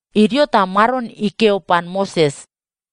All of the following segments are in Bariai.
Idio ta Maron ikeo pan Moses,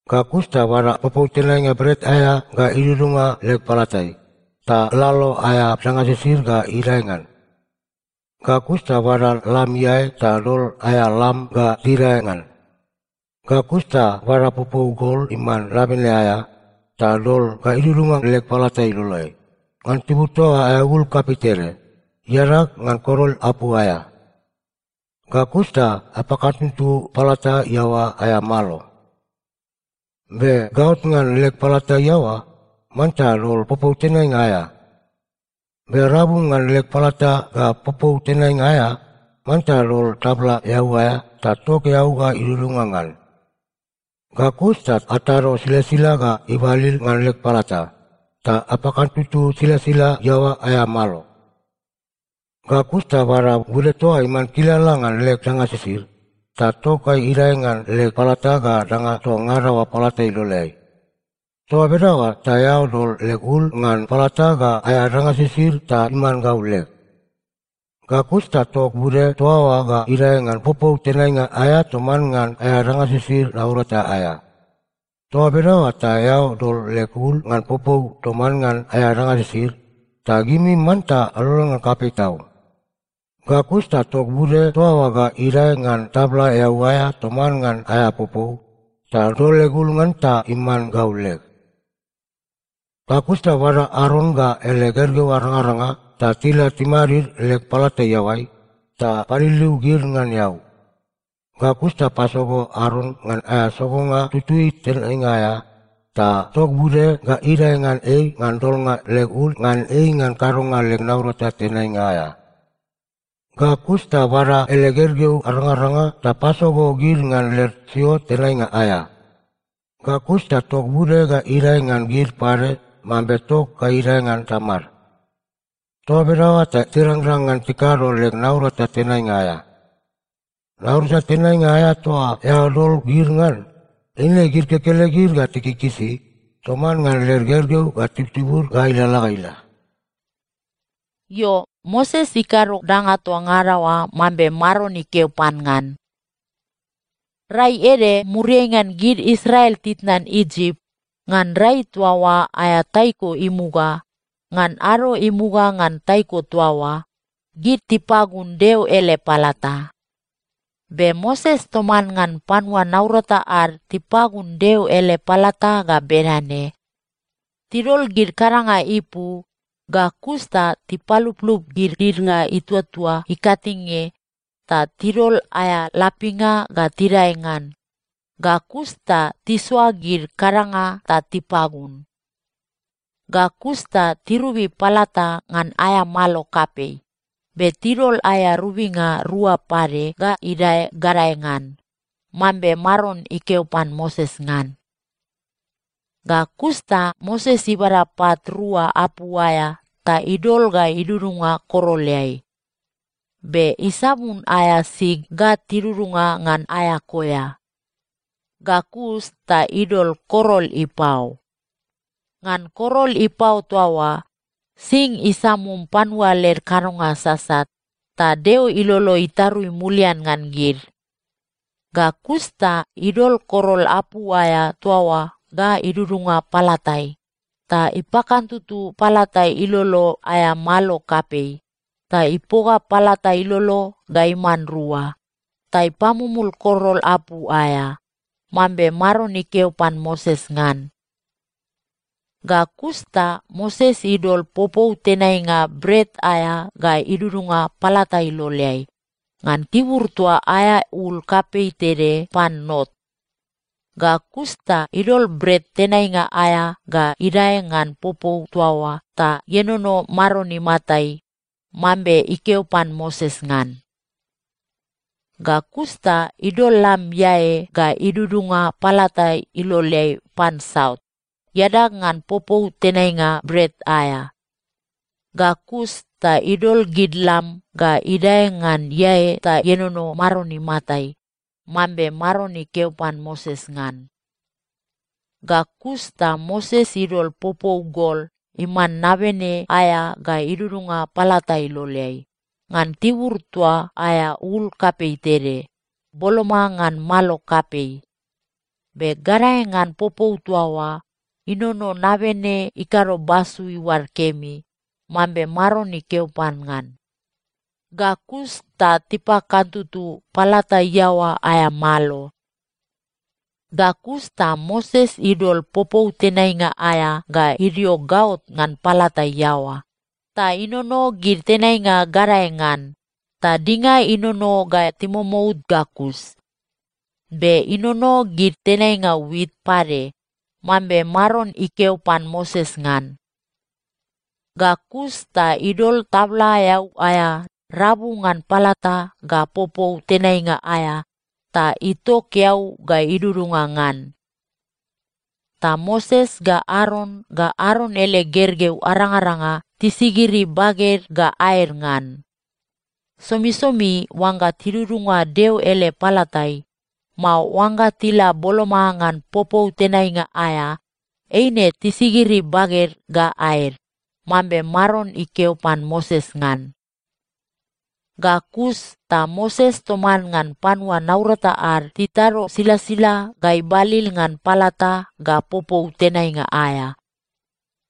Ga kus ta bada popou tenainga bret aea ga idudunga leg palatai, ta lalo aea danga sisid ga idae ngan. Ga kus ta bada lam iae ta dol aea lam ga tidae ngan. Ga kus ta bada popou gol iman nabene aea, ta dol ga idudunga leg palata iloleai, ngan tibur toa aea ul kapei tede, iadag ngan korol apu aea. Ga kus ta apakantutu palata iaoa aea malo. “Be gaot ngan leg palata iaoa, manta dol popou tenainga aea. Be rabu ngan leg palata ga popou tenainga aea, manta dol tabla eau aea, ta tok eau ga idudunga ngan. Ga kus ta atado silasila ga ibalil ngan leg palata, ta apakantutu silasila iaoa aea malo. “Ga kus ta bada bude toa iman kilala ngan leg danga sisid, ta tok ga idae ngan leg palata ga danga toa ngada oa palata iloleai. Toa bedaoa ta eao dol leg ul ngan palata ga aea danga sisid ta iman gau leg. Ga kus ta tok bude toa oa ga idae ngan popou tenainga aea toman ngan aea danga sisid naurata aea. Toa bedaoa ta eao dol leg ul ngan popou toman ngan aea danga sisid, ta gimi manta alolon ngan kapei tau. Ga kus ta tok bude toa oa ga idae ngan tabla eau aea toman ngan aea popou, ta dol leg ul ngan ta iman gau leg. “Ga kus ta bada Aron ga ele gergeu arangaranga ta tila timadid leg palata iaoai, ta paliliu gid ngan eau. Ga kus ta pasogo Aron ngan aea sogonga tutui tenainga aea, ta tok bude ga idae ngan ei ngan dolnga leg ul ngan ei ngan kadonga leg naurata tenainga aea. Ga kus ta bada ele gergeu arangaranga ta pasogo gid ngan led siot tenainga aea. Ga kus ta tok bude ga idae ngan gid pade mambe tok ga idae ngan tamad. Toa bedaoa ta tirangrang ngan tikado leg naurata tenainga aea. Naurata tenainga aea toa eao dol gid ngan, eine gid kekelegid ga tikikisi, toman ngan led gergeu ga tibutibud ga ilalala ga ila.” Io, Moses ikado danga toa ngada oa mambe Maron ikeo pan ngan. Rai ede muriai ngan gid Israel titnan Isip, ngan rai toa oa aea taiko imuga, ngan ado imuga ngan taiko toa oa, gid tipagun Deo ele palata. Be Moses toman ngan panua naurata ad tipagun Deo ele palata ga bedane: Tidol gid kadanga ipu, ga kus ta tipaluplup gid didnga ituatua ikatinge, ta tidol aea lapinga ga tidae ngan, ga kus ta tisoa gid kadanga ta tipagun. Ga kus ta tirobi palata ngan aea malo kapei, be tidol aea robinga rua pade ga idae gadae ngan, mambe Maron ikeo pan Moses ngan. Ga kus ta Moses ibada pat rua apu aea ta idol ga idudunga koroleai. Be isabun aea sig ga tidudunga ngan aea koea. Ga kus ta idol korol ipao. Ngan korol ipao toa oa sing isamum panua led kadonga sasat, ta Deo ilolo itarui mulian ngan gid. Ga kus ta idol korol apu aea toa oa ga idudunga palatai, ta ipakantutu palata ilolo aea malo kapei, ta ipoga palata ilolo ga iman rua, ta ipamumul korol apu aea, mambe Maron ikeo pan Moses ngan. Ga kus ta Moses idol popou tenainga bret aea ga idudunga palata iloleai, ngan tibur toa aea ul kapei tede pan not. Ga kus ta idol bret tenainga aea ga idae ngan popou toa oa ta ienono Maron imatai, mambe ikeo pan Moses ngan. Ga kus ta idol lam iae ga idudunga palata iloleai pan saut, iadag ngan popou tenainga bret aea. Ga kus ta idol gid lam ga idae ngan iae ta ienono Maron imatai, mambe Maron ikeo pan Moses ngan. Ga kus ta Moses idol popou gol iman nabene aea ga idudunga palata iloleai, ngan tibur toa aea ul kapei tede, boloma ngan malo kapei. Be gadae ngan popou toa oa, inono nabene ikado basu iuad kemi, mambe Maron ikeo pan ngan. Ga kus ta tipakantutu palata iaoa aea malo. Ga kus ta Moses idol popou tenainga aea ga idio gaot ngan palata iaoa, ta inono gid tenainga gadae ngan, ta dinga inono ga timomout ga kus. Be inono gid tenainga wit pade, mambe Maron ikeo pan Moses ngan. Ga kus ta idol tabla eau aea rabu ngan palata ga popou tenainga aea ta itok eau ga idudunga ngan. Ta Moses ga Aron ga Aron ele gergeu arangaranga tisigiri baged ga aed ngan. Somisomi oangga tidudunga Deo ele palatai, mao oangga tila boloma ngan popou tenainga aea, eine tisigiri baged ga aed, mambe Maron ikeo pan Moses ngan. Ga kus ta Moses toman ngan panua naurata ad titado silasila ga ibalil ngan palata ga popou tenainga aea.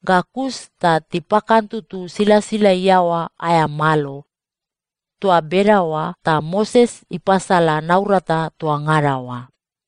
Ga kus ta tipakantutu silasila iaoa aea malo. Toa bedaoa ta Moses ipasala naurata toa ngada oa.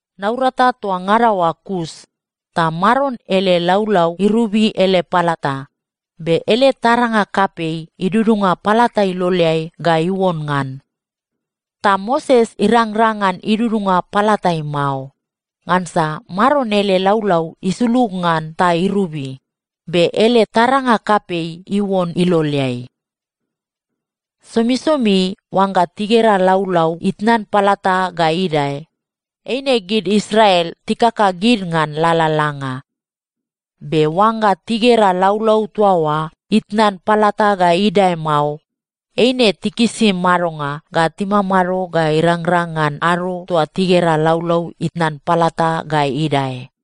Naurata toa ngada oa kus, ta Maron ele laulau irobi ele palata, be ele taranga kapei idudunga palata iloleai ga iuon ngan. Ta Moses irangrang ngan idudunga palatai mao, ngansa Maron ele laulau isulug ngan ta irobi, be ele taranga kapei iuon iloleai. Somisomi oangga tigera laulau itnan palata ga idae, eine gid Israel tikaka gid ngan lalalanga. Be oangga tigera laulau toa oa itnan palata ga idae mao, eine tikisi madonga ga timamado ga irangrang ngan ado toa tigera laulau itnan palata ga idae.